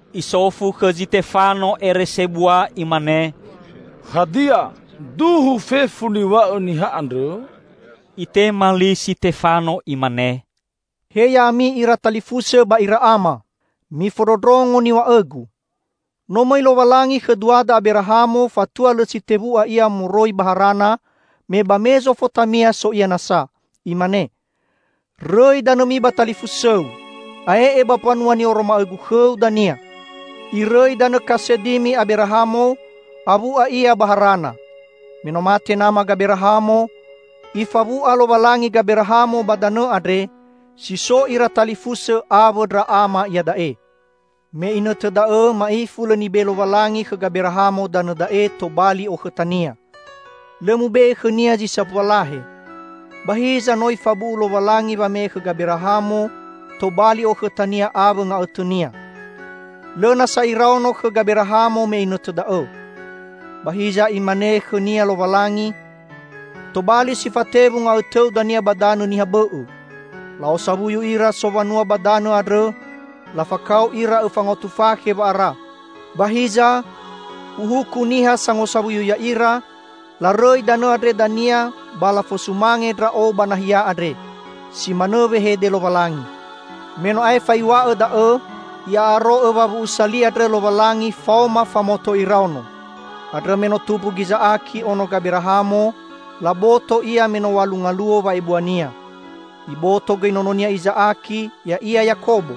Isofu khõ Zitefano ere sebua imane, "Hadia, duhu fefu niw̃a'õ niha andrõ?" Itema li Sitefano imane, "He ya'ami ira talifusõ ba ira Ama! Mifondrondrongo niw̃a'õgu! No mõi Lowalangi khõ duada Aberahamo fatua lõ si tewu'a ia moroi ba Harana, me ba Mezofotamia so ia nasa, imane, 'Rõi danõmi ba talifusõu. Ae'e ba mbanua ni'oroma'õ-Gu khõu dania.' Irõi danõ Kasedimi Aberahamo, awu'a ia ba Harana. Me no mate nama Gaberahamo, Ifawu'a Lowalangi Gaberahamo ba danõ andre, si so ira talifusõ awõ ndra ama iada'e. Me inõtõ da'õ ma'ifu lõ nibe'e Lowalangi khõ Gaberahamo danõ da'e tobali okhõtania; lõ mube'e khõnia zi sambua lahe. Ba hiza no Ifabu'u Lowalangi wame'e khõ Gaberahamo tobali okhõtania awõ nga'õtõnia. Lõ nasa iraono khõ Gaberahamo me inõtõ da'õ. Ba hiza Imane khõnia Lowalangi, 'Tobali si fatewu nga'õtõu dania ba danõ niha bõ'õ. La'osawuyu ira sowanua ba danõ andrõ lafakao ira õfa ngaotu fakhe wa'ara. Ba hiza, Uhuku niha sangosawuyu ya'ira, larõi danõ andrõ dania ba lafosumange Ndra'o ba nahia andre.' Si manõ wehede Lowalangi. Me no aefa Iw̃a'õ da'õ, I'a'aro'õ wawu'usa li andrõ Lowalangi faoma famoto iraono. Andrõ me no tumbu Giza'aki, ono Gaberahamo, laboto ia me no w̃alu ngaluo wa'ebuania. Iboto gõi nononia Iza'aki, ya'ia Yakobo.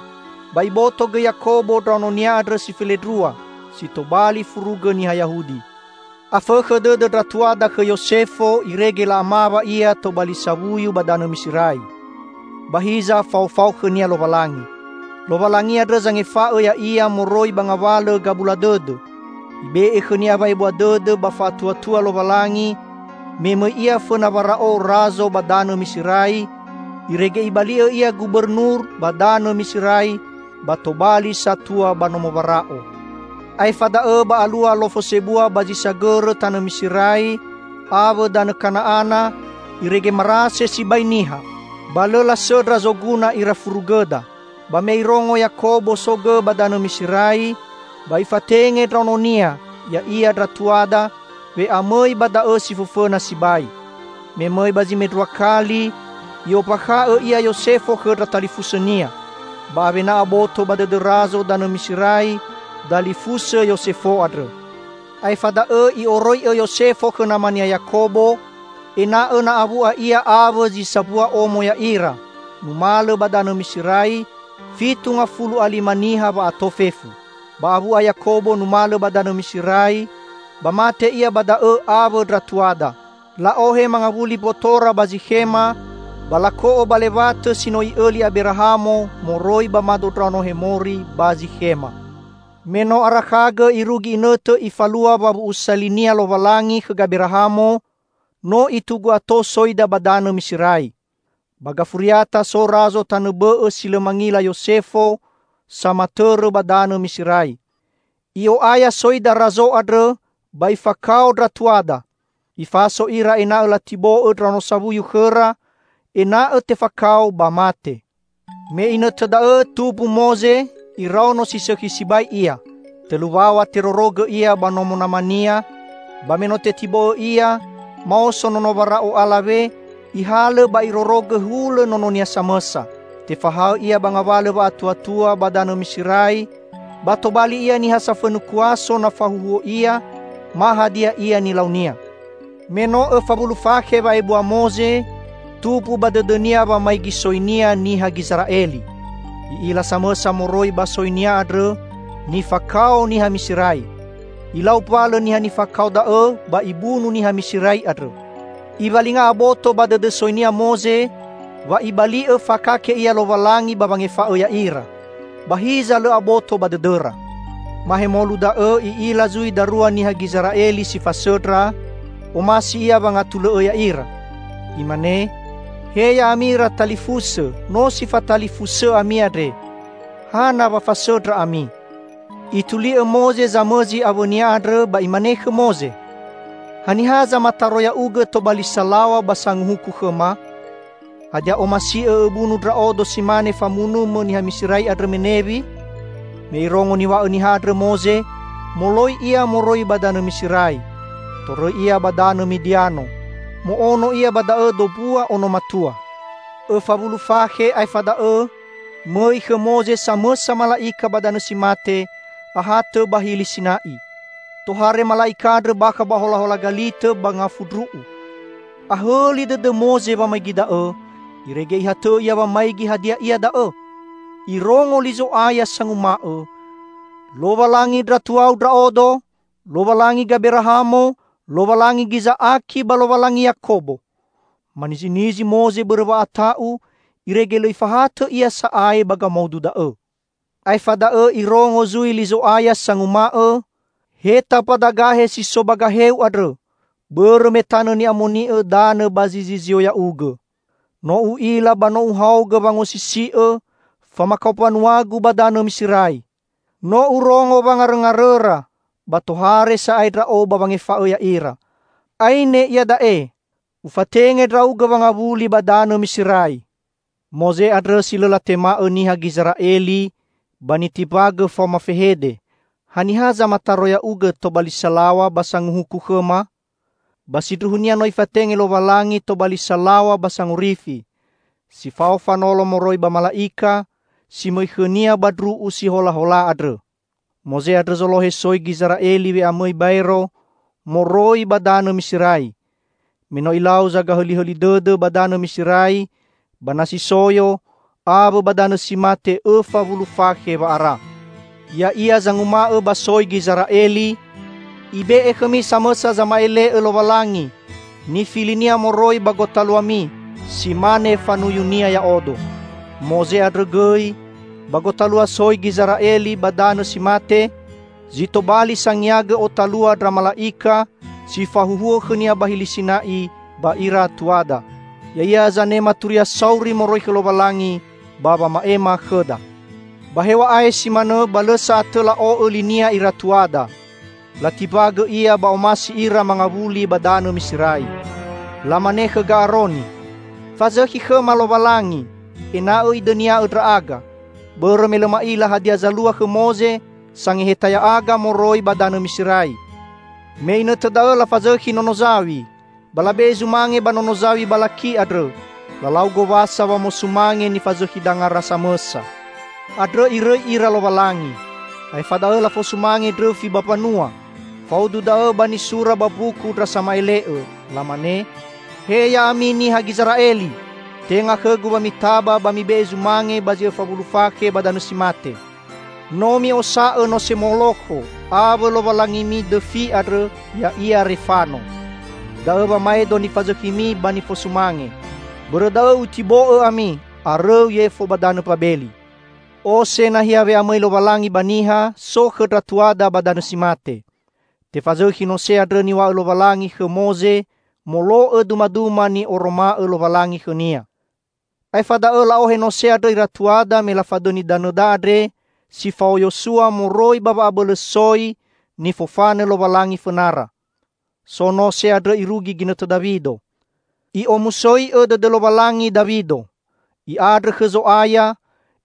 Ba iboto gõi Yakobo ndraononia andrõ si felendrua, si tobali furugõ niha Yahudi. Afõkhõ dõdõ ndra tuada khõ Yosefo irege la'amawa ia tobali sawuyu ba danõ Miserai. Ba hiza faofao khõnia Lowalangi. Lowalangi andrõ zangefa'õ ya'ia moroi ba ngawalõ gabula dõdõ. Ibe'e khõnia wa'ebua dõdõ ba fa'atuatua Lowalangi me mõi ia fõna Wara'o razo ba danõ Miserai, irege ibali'õ ia gubernur ba danõ Miserai ba tobali satua ba nomo Wara'o. Aefa da'õ ba alua lofo sebua ba zi sagõrõ tanõ Miserai awõ danõ Kana'ana, irege marase sibai niha. Ba lõ lasõndra zoguna ira furugõda. Ba me irongo Yakobo so gõ ba danõ Miserai, ba ifatenge ndraononia, ya'ia ndra tuada, we'amõi ba da'õ si fõfõna sibai. Me mõi ba zi mendrua kali, i'ombakha'õ ia Yosefo khõ ndra talifusõnia. Ba awena aboto ba dõdõ razo danõ Miserai dalifusõ Yosefo andrõ. Aefa da'õ i'oroi'õ Yosefo khõ namania Yakobo, ena'õ na awu'a ia awõ zi sambua omo ya'ira numalõ ba danõ Miserai -- fitu ngafulu a lima niha wa'ato fefu. Ba awu'a Yakobo numalõ ba danõ Miserai ba mate ia ba da'õ awõ ndra tuada. La'ohe mangawuli mbotora ba Zikhema ba lako'o ba lewatõ si no i'õli Aberahamo moroi ba mado ndraono Hemori ba Zikhema. Me no arakha irugi inõtõ Ifalua wawu'usa li-Nia Lowalangi khõ Gaberahamo, no itugu ato soida ba danõ Miserai. Ba gafuriata so razo tanõ bõ'õ si lõ mangila Yosefo samatõrõ ba danõ Miserai. I'o'aya soida razo andrõ ba ifakao ndra tuada. Ifaso ira ena'õ latibo'õ ndraono sawuyu khõra ena'õ tefakao ba mate. Me inõtõ da'õ tumbu Moze; iraono si sõkhi sibai ia. Tõlu waw̃a terorogõ ia ba nomo namania, ba me no tetibo'õ ia, maoso nono Wara'o alawe ihalõ ba irorogõ hulõ nononia samõsa. Tefahaõ ia ba ngawalõ wa'atuatua ba danõ Miserai ba tobali ia niha safõnu kuaso na fahuhuo ia ma hadia ia nilaunia. Me no õfa wulu fakhe wa'ebua Moze tumbu ba dõdõnia wamaigi soinia niha Gizera'eli. I'ila samõsa moroi ba soinia andrõ nifakao niha Miserai; ilau mbalõ niha nifakao da'õ ba ibunu niha Miserai andrõ. Iwalinga aboto ba dõdõ soinia Moze wa Ibali'õ fakake ia Lowalangi ba wangefa'õ ya'ira. Ba hiza lõ aboto ba dõdõra. Mahemolu da'õ i'ila zui darua niha Gizera'eli si fasõndra, omasi ia wangatulõ'õ ya'ira. Imane, 'He ya'ami ira talifusõ, no si fatalifusõ ami andre. Hana wa fasõndra ami?' Ituli'õ Moze zamõzi awõnia andrõ ba imane khõ Moze, 'Haniha zamataro ya'ugõ tobali salaw̃a ba sanguhuku khõma? Hadia omasi'õ õbunu ndra'odo si mane famunumõ niha Miserai andrõ menewi?' Me irongo niw̃a'õ niha andrõ Moze, moloi ia moroi ba danõ Miserai, torõi ia ba danõ Midiano. Mo'ono ia ba da'õ dombua ono matua. Õfa wulu fakhe aefa da'õ mõi khõ Moze samõsa mala'ika ba danõ si mate ahatõ ba Hili Sina'i. Tohare mala'ika andrõ bakha ba holahola galitõ ba ngafu ndru'u. Ahõli dõdõ Moze wamaigi da'õ, irege ihatõ'õ ia wamaigi hadia ia da'õ. Irongo li Zo'aya sanguma'õ, 'Lowalangi ndra tuau Ndra'odo; Lowalangi Gaberahamo, Lowalangi Giza'aki ba Lowalangi Yakobo.' Manizinizi Moze bõrõ wa'ata'u irege lõ ifahatõ ia sa'ae ba gamaudu da'õ. Aefa da'õ irongo zui li Zo'aya sanguma'õ, 'Heta mbadagahe si so ba gaheu andrõ. Bõrõ me tanõ ni'amoni'õ danõ ba zi zizio ya'ugõ. No U'ila ba no Uhaogõ wangosisi'õ famakao mbanua-Gu ba danõ Miserai. No Urongo wangarõngarõra ba tohare sa'ae Ndra'o ba wangefa'õ ya'ira. Aine, iada'e! Ufatenge ndra'ugõ wangawuli ba danõ Miserai.' Moze andrõ, si lõ latema'õ niha Gizera'eli ba nitimbagõ faoma fehede, 'Haniha zamataro ya'ugõ tobali salaw̃a ba sanguhuku khõma?' ba sindruhunia no nifatenge Lowalangi tobali salaw̃a ba sangorifi, si fao fanolo moroi ba mala'ika si mõi khõnia ba ndru'u si holahola andrõ. Moze andrõ zolohe soi Gizera'eli we'amõi baero moroi ba danõ Miserai, me no ilau zagahõlihõli dõdõ ba danõ Miserai, ba Nasi Soyo awõ ba danõ si mate õfa wulu fakhe wa'ara. Ya'ia zanguma'õ ba soi Gizera'eli, 'Ibe'e khõmi samõsa zama'ele'õ Lowalangi nifili-Nia moroi ba gotaluami, si mane fanuyu-Nia ya'odo.' Moze andrõ gõi, ba gotalua soi Gizera'eli ba danõ si mate, zi tobali sangiagõ otalua ndra mala'ika si fahuhuo khõnia ba Hili Sina'i ba ira tuada. Ya'ia zanema turia sauri moroi khõ Lowalangi ba wama'ema khõda. Ba hew̃a'ae si manõ ba lõ sa'atõ la'o'õ linia ira tuada. Latimbagõ ia ba omasi ira mangawuli ba danõ Miserai. Lamane khõ Ga'aroni, 'Fazõkhi khõma lowalangi, ena'õ idõnia'õ ndra'aga. Bõrõ me lõ ma'ila hadia zalua khõ Moze, sangeheta ya'aga moroi ba danõ Miserai!' Me inõtõ da'õ lafazõkhi nono zaw̃i, ba labe'e zumange ba nono zaw̃i balaki andrõ. Lalau gowasa wamosumange nifazõkhi dangara samõsa. Andrõ Irõi ira Lowalangi, aefa da'õ lafosumange ndrõfi ba mbanua. Faudu da'õ ba nisura ba mbuku ndra sama'ele'õ. Lamane, 'He ya'ami niha Gizera'eli! Tenga khõ-Gu wa mitaba ba mibe'e zumange ba zi õfa wulu fakhe ba danõ si mate. No mi'osa'õ nose Molokho awõ lowalangimi dõfi andrõ ya'ia Refano; da'õ wamaedo nifazõkhimi ba nifosumange. Bõrõ da'õ Utibo'õ ami arõu yefo ba danõ Mbabeli.' Ose nahia we'amõi Lowalangi ba niha, so khõ ndra tuada ba danõ si mate. Tefazõkhi nose andrõ niw̃a'õ Lowalangi khõ Moze molo'õ dumaduma ni'oroma'õ Lowalangi khõnia. Aefa da'õ la'ohe nose andrõ ira tuada me lafadõni danõda andre si fao Yosua moroi ba wa'abõlõ soi nifofanõ Lowalangi fõnara. So nose andrõ irugi ginõtõ Dawido. I'omusoi'õ dõdõ Lowalangi Dawido. I'andrõ khõ Zo'aya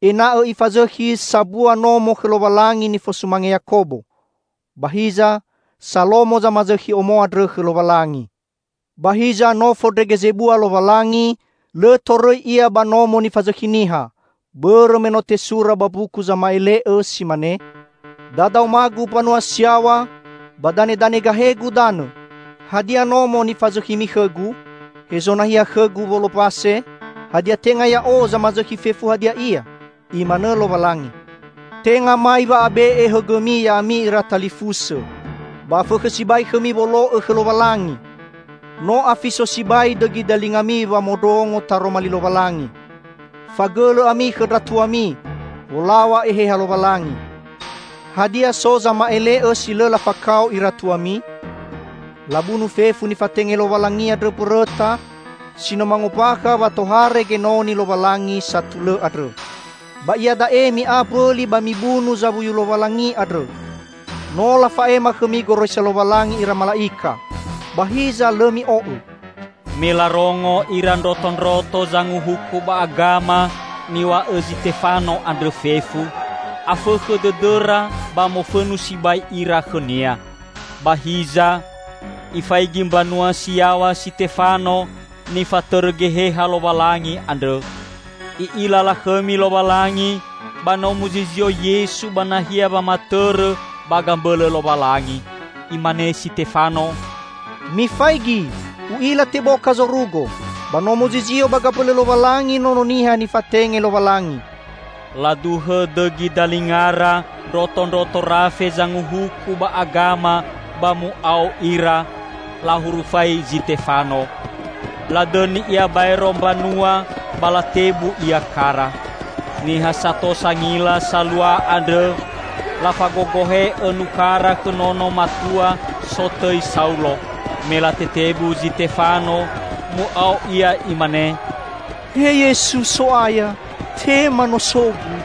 ena'õ ifazõkhi sambua nomo khõ Lowalangi nifosumange Yakobo. Ba hiza Salomo zamazõkhi omo andrõ khõ Lowalangi. Ba hiza no fondrege zebua Lowalangi lõ torõi Ia ba nomo nifazõkhi niha; bõrõ me no tesura ba mbuku zama'ele'õ si mane, 'Dadaoma-Gu mbanua si yaw̃a, ba danedane gahe-Gu danõ. Hadia nomo nifazõkhimi khõ-Gu? Hezo nahia khõ-Gu wolombase? Hadia tenga Ya'o zamazõkhi fefu hadia ia?' Imanõ Lowalangi. Tenga mai wa'abe'e hõgõmi ya'ami ira talifusõ ba afõkhõ sibai khõmi wolo'õ khõ Lowalangi! No afiso sibai dõgi dalingami wamondrongo Taroma Li Lowalangi! Fagõlõ ami khõ ndra tuami; wolaw̃a Eheha Lowalangi! Hadia so zama'ele'õ si lõ lafakao ira tuami? Labunu fefu nifatenge Lowalangi andrõ mbõrõta si no mangombakha wa tohare Genoni Lowalangi satulõ andrõ. Ba iada'e mi'a mbõli ba mibunu Zawuyu Lowalangi andrõ. No lafa'ema khõmi goroisa Lowalangi ira mala'ika, ba hiza lõ mi'o'õ!" Me larongo ira ndrotondroto Zanguhuku ba Agama niw̃a'õ Zitefano andrõ fefu, afõkhõ dõdõra ba mofõnu sibai ira khõnia. Ba hiza, ifaigi mbanua si yaw̃a Sitefano nifatõrõ Geheha Lowalangi andrõ. I'ila lakhõmi Lowalangi ba no muzizio Yesu ba nahia wamatõrõ ba gambõlõ Lowalangi. Imane Sitefano, "Mifaigi, u'ila teboka zorugo ba no muzizio ba gambõlõ Lowalangi Nono Niha nifatenge Lowalangi!" Laduhõ dõgi dalingara ndrotondroto rafe Zanguhuku ba Agama ba mu'ao ira, lahurufai Zitefano. Ladõni ia baero mbanua ba latebu ia kara. Niha sato sangila salua andrõ, lafagogohe'õ nukhara khõ nono matua sotõi Saulo. Me latetebu Zitefano, mu'ao ia imane, "He Yesu So'aya, tema nosogu!"